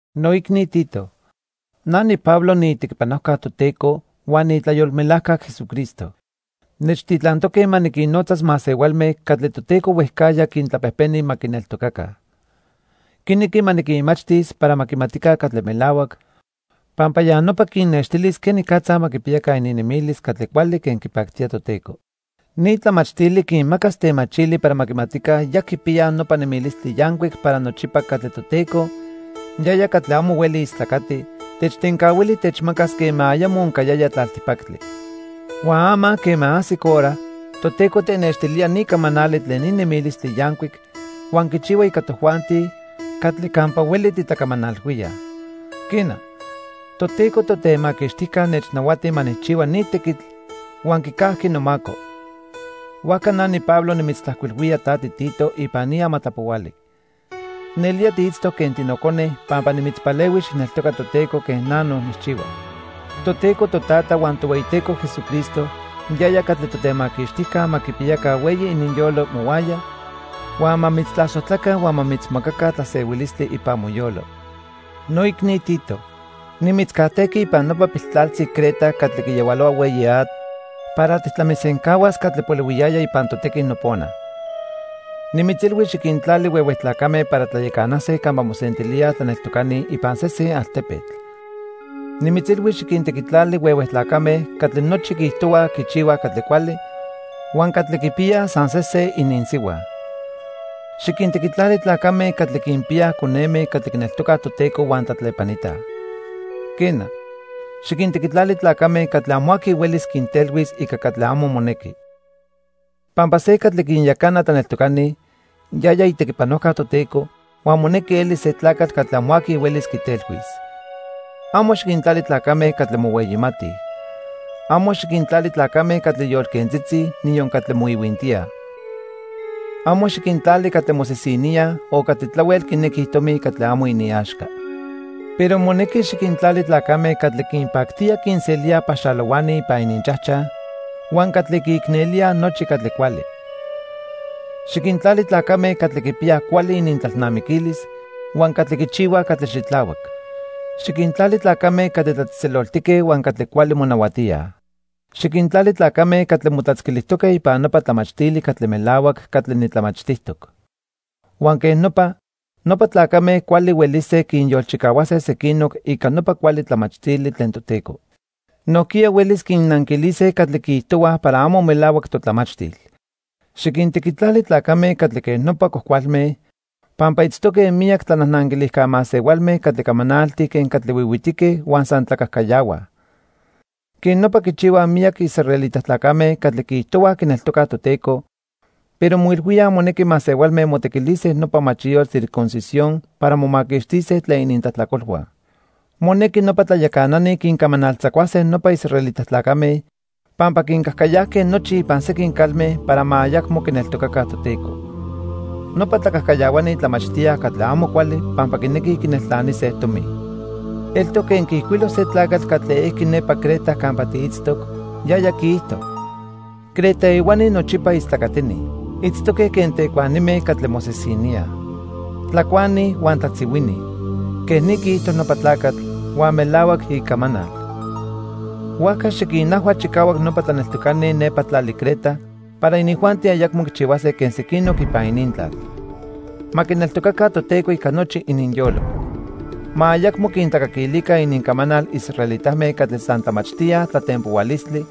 Noicni Tito, na niPablo niitequipanojca Toteco huan niitlayolmelajca Jesucristo. Nechtitlantoque ma niquinnotzas masehualme catli Toteco huejcajya quintlapejpeni ma quineltocaca. Quinequi ma niquinmachtis para ma quimatica catli melahuac, pampa ya nopa quinnextilis quenicatza ma quipiyaca ininnemilis catli cuali quen quipactía Toteco. Ni tlamachtili quinmacas temachili para ma quimatica ya quipiyaj nopa nemilistli yancuic para nochipa catli Toteco, yaya catli amo hueli istlacati, techtencahuili techmacas quema ayamo oncayaya tlaltipactli. Huan ama quema ajsic hora, Toteco tenextilía ni camanali tlen ni nemilistli yancuic huan quichihua ica tojuanti catli campa hueli titlacamanalhuíaj. Quena, Toteco Totemaquixtijca nechnahuati ma nijchihua ni tequitl huan quicajqui nomaco. Huajca na niPablo nimitztlajcuilhuía ta tiTito ipan ni amatlapohuali. Nelía tiitztoc quen tinocone pampa nimitzpalehui xijneltoca Toteco quen na no nijchihua. Toteco Totata huan Tohueyiteco Jesucristo yaya catli Totemaquixtijca ma quipiyaca hueyi ininyolo mohuaya huan ma mitztlasojtlaca huan ma mitzmacaca tlasehuilistli ipan moyolo. Noicni Tito, nimitzcajtejqui ipan nopa piltlaltzi Creta catli quiyahualohua hueyi atl para tijtlamisencahuas catli polihuiyaya ipan totequi nopona. Nimitzilhui xiquintlali huehue tlacame para tlayacanase campa mosentilíaj tlaneltocani ipan sesen altepetl. Nimitzilhui xiquintequitlali huehue tlacame catli nochi quiijtohuaj quichihuaj catli cuali huan catli quipiyaj san se se ininsihua. Xiquintequitlali tlacame catli quinpiyaj coneme catli quineltocaj Toteco huan tlatlepanitaj. Quena, xiquintequitlali tlacame catli amo aqui huelis quintelhuis ica catli amo monequi. Pampa se catli quinyacana tlaneltocani, yaya itequipanojca Toteco huan monequi elis se tlacatl catli amo aqui huelis quitelhuis. Amo xiquintlali tlacame catli mohueyimatij. Amo xiquintlali tlacame catli yolquentzitzi, niyon catli moihuintíaj. Amo xiquintlali catli mosisiníaj o catli tlahuel quinequij tomi catli amo iniaxca. Pero monequi xiquintlali tlacame catli quinpactía quinselíaj paxalohuani ipan ininchajchaj huan catli quiicnelíaj nochi catli cuali. Xiquintlali tlacame catli quipiyaj cuali inintlalnamiquilis huan catli quichihuaj catli xitlahuac. Xiquintlali tlacame catli tlatzejtzeloltique huan catli cuali monahuatíaj. Xiquintlali tlacame catli motlatzquilijtoque ipan nopa tlamachtili catli melahuac catli nitlamachtijtoc. Huan quej nopa, nopa tlacame cuali huelise quinyolchicahuase sequinoc ica nopa cuali tlamachtili tlen Toteco. Nojquiya huelis quinnanquilise catli quiijtohuaj para amo melahuac totlamachtil. Xiquintequitlali tlacame catli quej nopa cuajcualme pampa itztoque miyac tlanajnanquilijca masehualme catli camanaltij quen catli huihuitique huan san tlacajcayahuaj. Quej nopa quichihuaj miyac israelita tlacame catli quiijtohuaj quineltocaj Toteco, pero moilhuíaj monequi masehualme motequilise nopa machiyotl circuncisión para momaquixtise tlen inintlajtlacolhua. Monequi nopa tlayacanani quincamanaltzacuase nopa israelita tlacame pampa quincajcayajque nochi ipan sequin calme para ma ayacmo quineltocaca Toteco. Nopa tlacajcayahuani tlamachtíaj catli amo cuali pampa quinequij quineltlanise tomi. Eltoc quen quiijcuilo se tlacatl catli ejqui nepa Creta campa tiitztoc, yaya quiijto: "Creta ehuani nochipa istlacatini. Itztoque quen tecuanime catli mosisiníaj. Tlacuani huan tlatzihuini." Quej ni quiijto nopa tlacatl, huan melahuac icamanal. Huajca, xiquinajhua chicahuac nopa tlaneltocani nepa tlali Creta para inijuanti ayacmo quichihuase quen sequinoc ipan inintlal. Ma quineltocaca Toteco ica nochi ininyolo. Ma ayacmo quintlacaquilica inincamanal israelitame catli san tlamachtíaj tlatempohualistli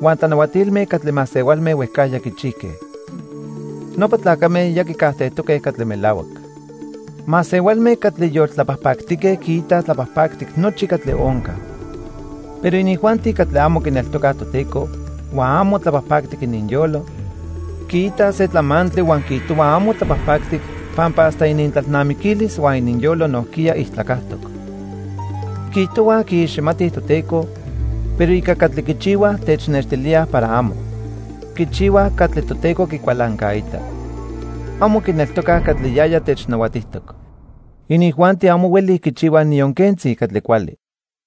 huan tlanahuatilme catli masehualme huejcajya quichijque. Nopa tlacame ya quicajtejtoque catli melahuac. Masehualme catli yoltlapajpactique quiitaj tlapajpactic nochi catli onca. Pero inijuanti catli amo quineltocaj Toteco huan amo tlapajpactic ininyolo, quiitaj se tlamantli huan quiijtohuaj amo tlapajpactic pampa hasta inintlalnamiquilis huan ininyolo nojquiya ijtlacajtoc. Quiijtohuaj quiiximatij Toteco, pero ica catli quichihuaj, technextilíaj para amo. Quichihuaj catli Toteco quicualancaita. Amo quineltocaj catli yaya technahuatijtoc. Inijuanti amo huelij quichihuaj niyon quentzi catli cuali.